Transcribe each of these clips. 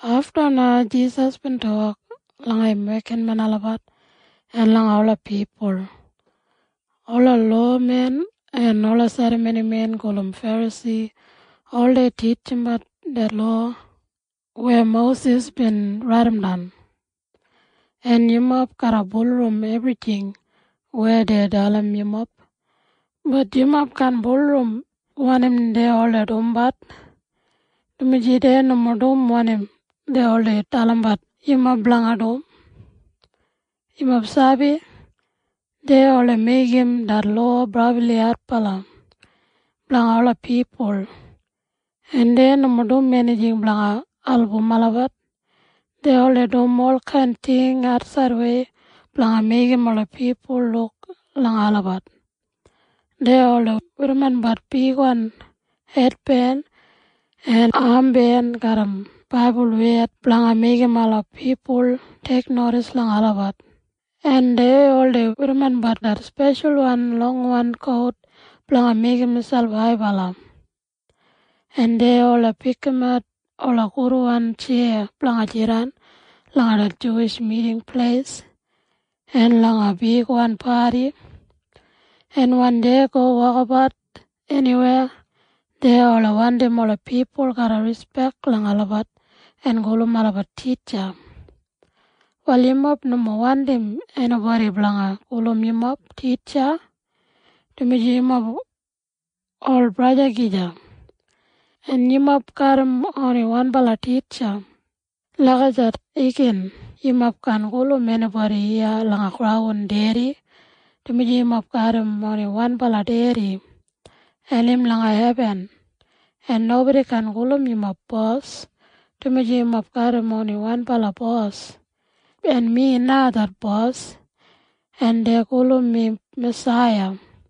Afta na Jisas bin tok langa im wekinmen olabat en langa ola pipul, “Ola lowamen en ola serramonimen gulum Ferasi oldei titjimbat det lowa weya Mosis bin raidimdan, en yumob garra bulurrum ebrijing weya dei dalim yumob. Bat yumob kaan bulurrum wanim dei oldei dumbat, dumaji dei nomo dum wanim dei oldei dalimbat yumob blanga dum. Yumob sabi? Dei oldei meigim det lowa brabli adbala blanga ola pipul blanga dum, en dei nomo dum enijing blanga album olabat. Dei oldei dum olkain ting atsaidwei blanga meigim ola pipul luk langa olabat. Dei oldei werrimbat bigwan hetben en amben garram baibul wed blanga meigim ola pipul teiknodis langa olabat, en dei oldei werrimbat det speshalwan longwan kout blanga meigim miselp haibala, en dei oldei pikimat ola gudwan tjeya blanga jidan langa det Juwish Miting Pleis en langa bigwan padi, en wen dei go wokabat eniweya, dei oldei wandim ola pipul garra rispek langa olabat en gulum olabat ‘Titja’. “Wal yumob nomo wandim enibodi blanga gulum yumob ‘Titja’, dumaji yumob ol femili gija, en yumob garram oni wanbala Titja. Lagijat igin yumob kaan gulum enibodi iya langa graun ‘Dedi’, dumaji yumob garram oni wanbala Dedi, en im langa hebin. En nobodi kaan gulum yumob ‘Bos’, dumaji yumob garram oni wanbala Bos, en mi na det Bos, en dei gulum mi Masaiya.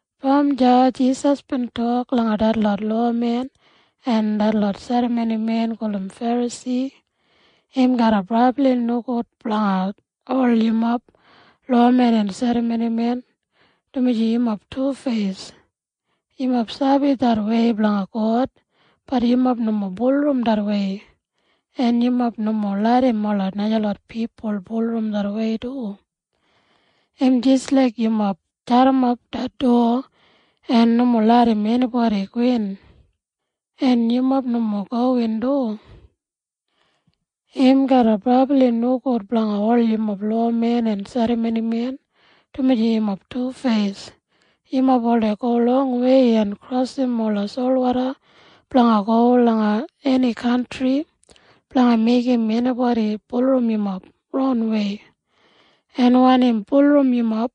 Brom deya Jisas bin tok langa detlot lowamen en detlot serramonimen gulum Ferasi, “Im garra brabli nogud blanga ol yumob lowamen en serramonimen, dumaji yumob tufeis. Yumob sabi det wei blanga God. Bat yumob nomo bulurrum det wei, en yumob nomo larram ola najalot pipul bulurrum det wei du. Im jis laik yumob jadimap det dowa en nomo larram enibodi gowin, en yumob nomo gowin du. “Im garra brabli nogud blanga ol yumob lowamen en serramonimen, dumaji yumob tufeis. Yumob oldei go longwei en krosim ola solwoda blanga go langa eni kantri blanga meigim enibodi bulurrum yumob ronwei, en wen im bulurrum yumob,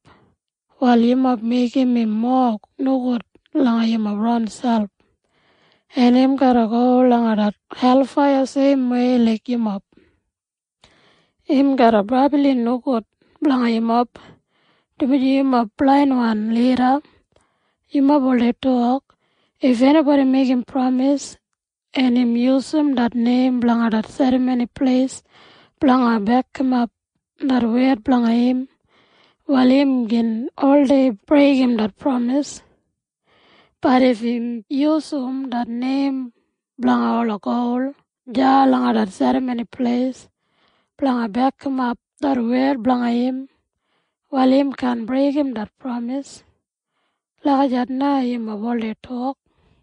wal yumob meigim im mowa nogud langa yumob ronselp, en im garra go langa det helfaiya seimwei laik yumob. “Im garra brabli nogud blanga yumob, dumaji yumob blainwan lida. Yumob oldei tok, ‘If enibodi meigim pramis, en im yusum det neim blanga det Serramoni Pleis blanga bekimap det wed blanga im, wal im gin oldei breigim det pramis. Bat if im yusum det neim blanga ola gol deya langa det Serramoni Pleis blanga bekimap det wed blanga im, wal im kaan breigim det pramis.’ Lagijat na yumob oldei tok.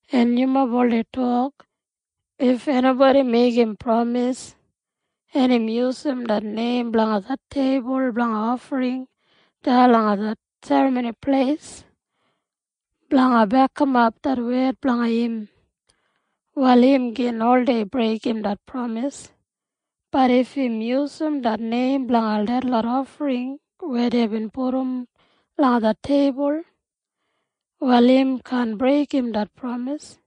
En yumob oldei tok, ‘If enibodi meigim pramis, en im yusum det neim blanga det teibul blanga ofring deya langa Serramoni Pleis blanga bekimap det wed blanga im, wal im gin oldei breigim det pramis. Bat if im yusum det neim blanga detlot ofring weya deibin pudum langa det teibul, wal im kaan breigim det pramis.’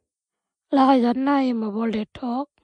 Lagijat na yumob oldei tok.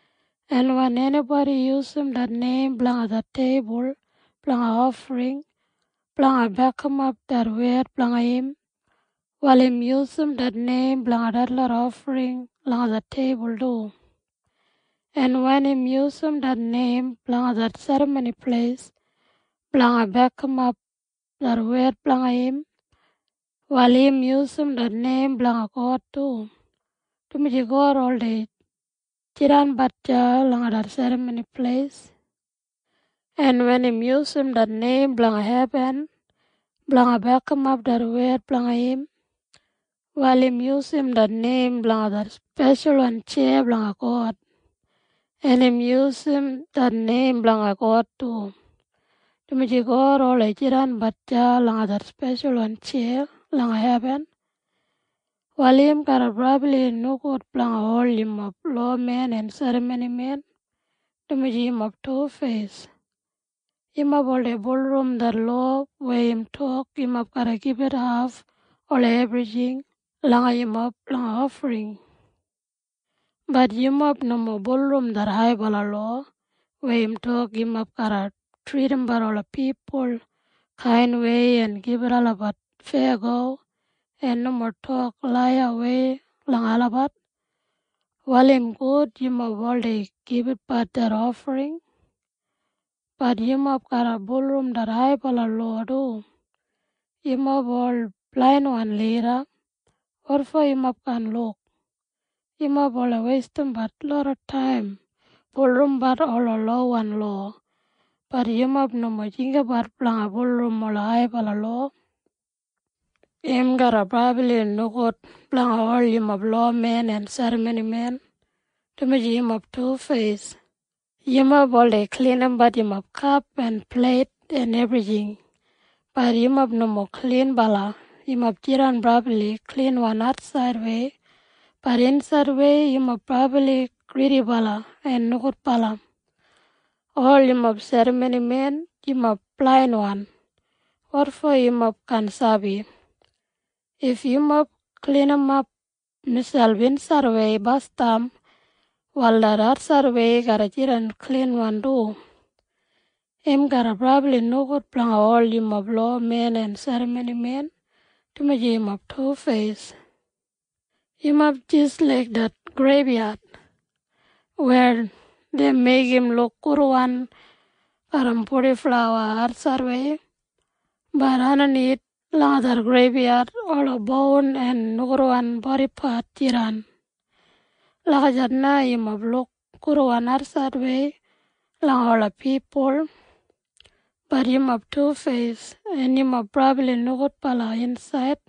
En wen enibodi yusum det neim blanga det teibul blanga ofring blanga bekimap det wed blanga im, wal im yusum det neim blanga detlot ofring langa det teibul du. En wen im yusum det neim blanga det Serramoni Pleis blanga bekimap det wed blanga im, wal im yusum det neim blanga God du, dumaji God oldei jidanbat deya langa det Serramoni Pleis. En wen im yusum det neim blanga hebin blanga bekimap det wed blanga im, wal im yusum det neim blanga det speshalwan tjeya blanga God, en im yusum det neim blanga God du, dumaji God oldei jidanbat deya langa det speshalwan tjeya langa hebin. “Wal im garra brabli nogud blanga ol yumob lowamen en serramonimen, dumaji yumob tufeis. Yumob oldei bulurrum det lowa weya im tok yumob garra gibit haf ola ebrijing blanga yumob langa ofring. Bat yumob nomo bulurrum det haibala lowa weya im tok yumob garra tridimbat ola pipul kainwei en gibit olabat feyago en nomo tok laiyawei langa olabat. Wal im gud yumob oldei gibitbat det ofring. Bat yumob garra bulurrum det haibala lowa du. Yumob ol blainwan lida. Wotfo yumob kaan luk? Yumob oldei weistimbat loda taim bulurrumbat ola lowan lowa. Bat yumob nomo jinggabat blanga bulurrum ola haibala lowa. “Im garra brabli nogud blanga ol yumob lowamen en serramonimen, dumaji yumob tufeis. Yumob oldei klinimbat yumob kap en pleit en ebrijing. Bat yumob nomo klinbala. Yumob jidan brabli klinwan atsaidwei. Bat insaidwei yumob brabli gridibala en nogudbala. Ol yumob serramonimen, yumob blainwan. Wotfo yumob kaan sabi? If yumob klinimap miselp insaidwei basdam, wal det atsaidwei garra jidan klinwan du. “Im garra brabli nogud blanga ol yumob lowamen en serramonimen, dumaji yumob tufeis. Yumob jis laik det greibyad weya dei meigim luk gudwan garram purdiflawa atsaidwei. Bat andanith langa det greibyad ola boun en nogudwan bodipat jidan. Lagijat na yumob luk gudwan atsaidwei langa ola pipul. Bat yumob tufeis, en yumob brabli nogudbala insaid.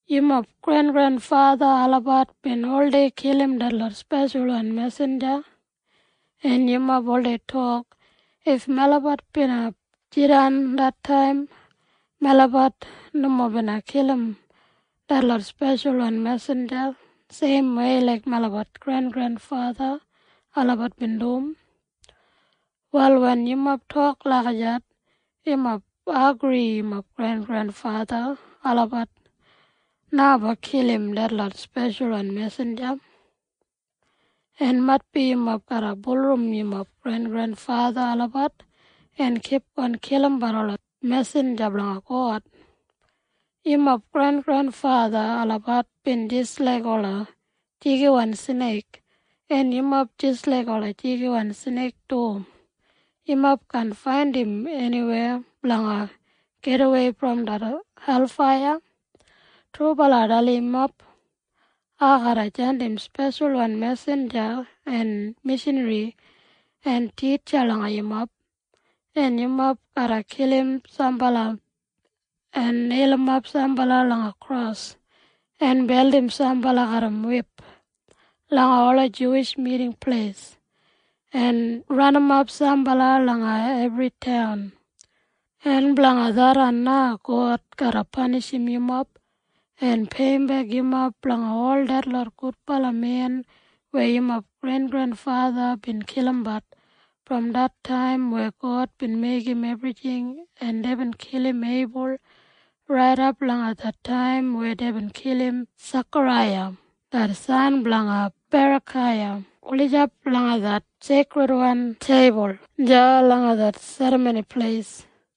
Yumob grengrenfatha olabat bin oldei kilim detlot speshalwan mesinja, en yumob oldei tok, ‘If melabat bina jidan det taim, melabat nomo bina kilim detlot speshalwan mesinja seimwei laik melabat grengrenfatha olabat bin dum.’ Wal wen yumob tok lagijat, yumob agri yumob grengrenfatha olabat na bin kilim detlot speshalwan mesinja. En maitbi yumob garra bulurrum yumob grengrenfatha olabat en kipgon kilimbat ola mesinja blanga God. Yumob grengrenfatha olabat bin jis laik ola jigiwan sneik, en yumob jis laik ola jigiwan sneik du! Yumob kaan faindim eniwei blanga gidawei brom det helfaiya. “Trubala ai dalim yumob. Ai garra jandim speshalwan mesinja en mishanri en titja langa yumob, en yumob garra kilim sambala en neilimap sambala langa kros en beldim sambala garram wip langa ola Juwish Miting Pleis en ranimap sambala langa ebri taun. En blanga tharran na God garra panishim yumob en peiyimbek yumob blanga ol detlot gudbala men weya yumob grengrenfatha bin kilimbat brom det taim weya God bin meigim ebrijing en deibin kilim Eibul raidap langa det taim weya deibin kilim Sekaraiya det san blanga Berakaiya gulijap langa det seikridwan teibul deya langa det Serramoni Pleis.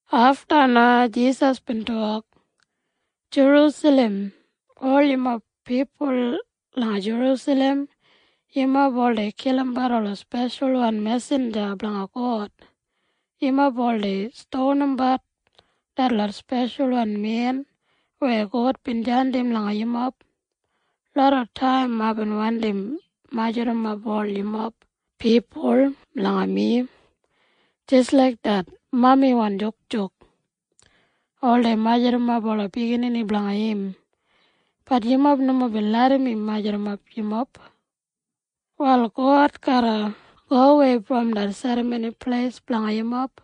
Afta na Jisas bin tok, “Jerusalem! Ol yumob pipul langa Jerusalem! Yumob oldei kilimbat ola speshalwan mesinja blanga God! Yumob oldei stonimbat detlot Speshalwan Men weya God bin jandim langa yumob! Lodataim aibin wandi majurrumap ol yumob pipul langa mi jis laik det mamiwan jukjuk oldei majurrumap ola biginini blanga im. Bat yumob nomo bin larram mi majurrumap yumob! Wal God garra gowei brom det Serramoni Pleis blanga yumob.